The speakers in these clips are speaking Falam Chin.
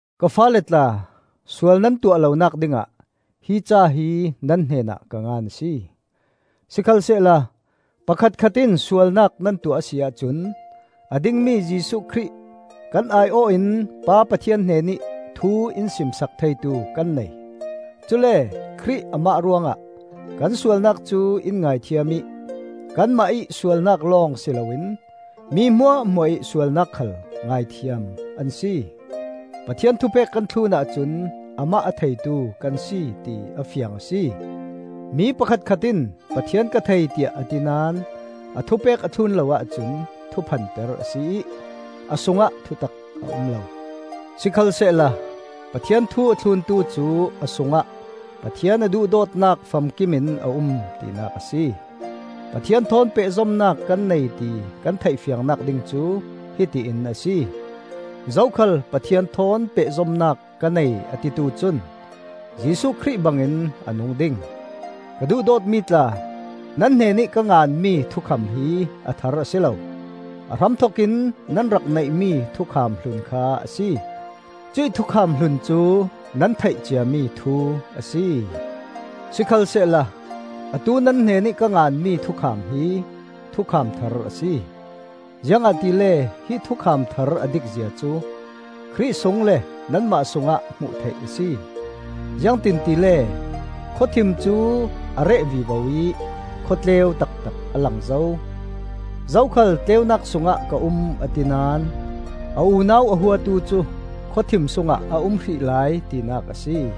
Ka faale tla, sual nan tuah lonak dingah hi ca hi nan hnenah ka ngan a si. Sikhalsehla pakhatkhat in sualnak nan tuah a si ahcun a dingmi Jesuh Khrih, kan ai-awh in Pa Pathian hnenih thu in simsak theitu kan nei. Cule Khrih amah ruangah kan sualnak cu in ngaithiam ih kanmah ih sualnak lawng si loin mi hmuahhmuah ih sualnak khal ngaithiam an si. Pathian thupek kan thlun ahcun amah a theitu kan si ti a fiang a si. Mi pakhatkhat in Pathian ka thei tiah a ti naón a thupek a thlun lo ahcun thuphanper a si ih a sungah thutak a um lo. Sikhalsehla Pathian thu a thluntu cu a sungah Pathian a duhdawtnak famkimin a um tinak a si. Pathian thawn pehzomnak kan nei ti kan theih fiangnak ding cu hiti in a si: Zokhal Pathian thawn pehzomnak ka nei a titu cun Jesuh Khrih bangin a nung ding. Ka duhdawtmi tla, nan hnenih ka nganmi thukham hi a thar a si lo; a hramthokin nan rak neihmi thukham hlun kha a si. Cuih thukham hlun cu nan theih ciami thu a si. Sikhalsehla atu nan hnenih ka nganmi thukham hi thukham thar a si, ziangahtile hi thukham thar a dik zia cu Khrih sung le nanmah sungah hmuh theih a si. Ziangtin tile khawthim cu a reh vivo ih khawtleu taktak a lang zo. Zokhal tleunak sungah ka um a ti naón a unau a huatu cu khawthim sungah a um hrih lai tinak a si.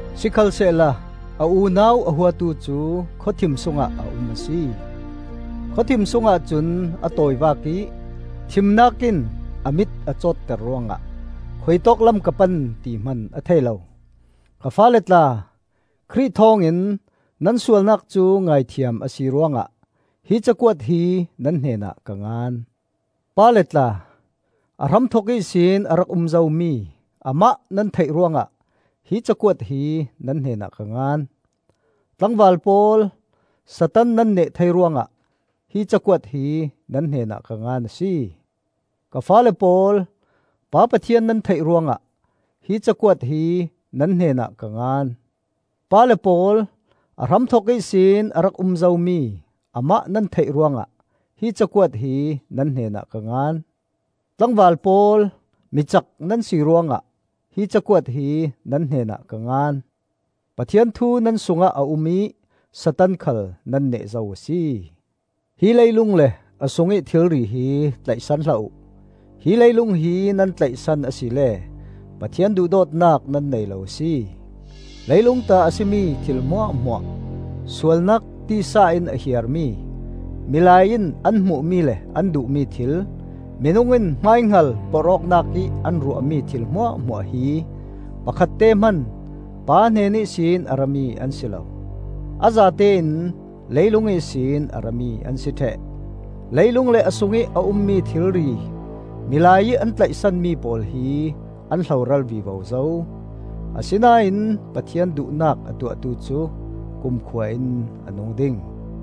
Sikhalsehla a unau a huatu cu khawthim sungah a um a si; khawthim sungah cun a tawivak ih thimnak in a mit a cawtter ruangah khuitawk lam ka pan ti hman a thei lo. Ka faale tla, Khrih thawngin nan sualnak cu ngaithiam a si ruangah hi cakuat hi nan hnenah ka ngan. Pale tla, a hramthok ihsin a rak um zomi Amah nan theih ruangah hi cakuat hi nan hnenah ka ngan. Tlangval pawl, Satan nan neh thei ruangah hi cakuat hi nan hnenah ka ngan a si. Ka faale pawl, Pa Pathian nan theih ruangah hi cakuat hi nan hnenah ka ngan. Pale pawl, a hramthok ihsin a rak um zomi Amah nan theih ruangah hi cakuat hi nan hnenah ka ngan. Tlangval pawl, micak nan si ruangah hi cakuat hi nan hnenah ka ngan; Pathian thu nan sungah a um ih Satan khal nan neh zo a si. Hi leilung le a sungih thilri hi tlaihsan hlah uh; hi leilung hi nan tlaihsan asile Pathian duhdawtnak nan nei lo a si. Leilung ta a si mi thil hmuahhmuah: sualnak tisa in a hiar mi, milai in an hmuhmi le an duhmi thil, minung in hmaihngal porh awknak ih an ruahmi thil hmuahhmuah hi pakhatte hman Pa hnen ihsin a rami an si lo. A zatein leilung ihsin a rami an si ṭheh. Leilung le a sungih a ummi thilri, milai ih an tlaihsanmi pawl hi an hloral vivo zo; asinain Pathian duhnak a tuahtu cu kumkhua in a nung ding.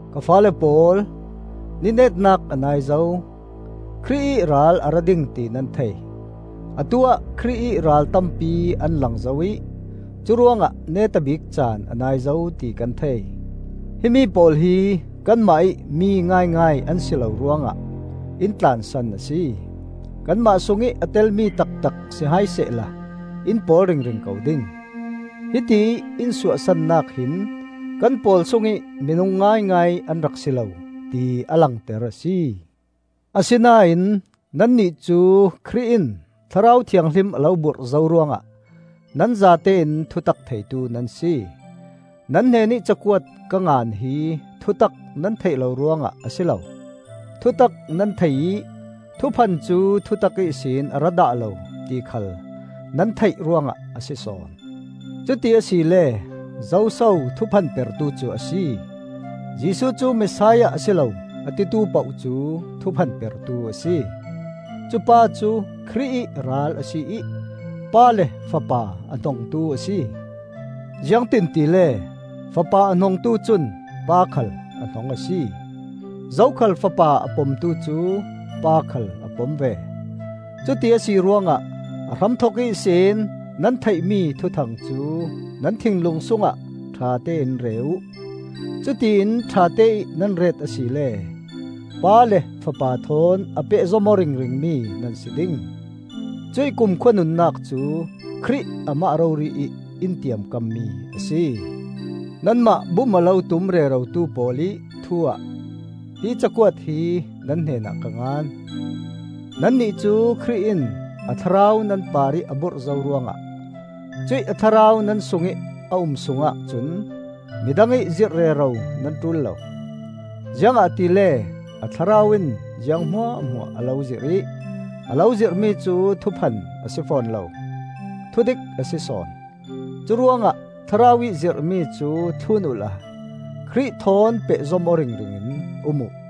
Ka faale pawl, ni netnak a nai zo. Khrih ih Ral a ra ding ti nan thei; atu-ah Khrih ih ral tampi an lang zo ih curuangah neta bik caan a nai zo ti kan thei. Himi pawl hi kanmah ih mi ngaingai an si lo ruangah in tlansan a si. Kanmah sungih a telmi taktak si hai sehla in pawl ringring ko ding. Hitiih in suahsannak hin kan pawl sungih minung ngaingai an rak si lo, ti a langter a si. Asinain nannih cu Khrih in Thlarau Thianghlim a lo burh zo ruangah nan zatein thutak theitu nan si. Nan hnenih cakuat ka ngan hi thutak nan theih lo ruangah a si lo; thutak nan thei ih thuphan cu thutak ihsin a ra dah lo ti khal nan theih ruangah a si sawn. Cuti asile zoso thuphanpertu cu a si? Jesuh cu Messiah a si lo, a titu poh cu thuphanpertu a si. Cupa cu Khrih ih Ral a si ih Pa le Fapa a hnongtu a si. Ziangtin tile, Fapa a hnongtu cun Pa khal a hnong a si. Zokhal Fapa a pomtu cu Pa khal a pom ve. Cuti a si ruangah a hramthok ihsin nan theihmi thuthang cu nan thinlung sungah ṭhatein re uh. Cutiin ṭhateih nan ret asile Pa le Fapa thawn a pehzom aw ringringmi nan si ding. Cuih kumkhua nunnak cu Khrih amah rori ih in tiamkammi a si. Nanmah bum a lo tum rerotu pawl ih thu-ah hi cakuat hi nan hnenah ka ngan. Nannih cu Khrih in a Thlarau nan parih a burh zo ruangah cuih a Thlarau nan sungih a um sungah cun midang ih zirh rero nan ṭul lo. Ziangahtile a Thlarau in ziang hmuahhmuah a lo zirh ih a lo zirhmi cu thuphan a si fawn lo, thudik a si sawn. Curuangah Thlarau ih zirhmi cu thlun uhla Khrih thawn pehzom aw ringring in um uh.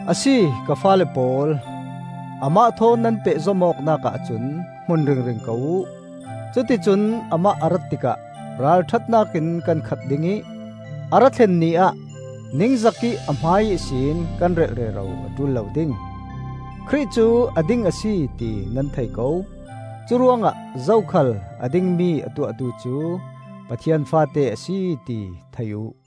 A si, ka faale pawl, amah thawn nan pehzom awknak ahcun hmun ringring ko uh; cuticun amah a rat tikah ralṭhatnak in kan khat ding ih a ra thlen Ni ah ningzakih a hmai-ihsin kan relh rero a ṭul lo ding. Khrih cu a ding a si ti nan thei ko; curuangah zokhal a dingmi a tuahtu cu Pathian faate a si ti thei uh.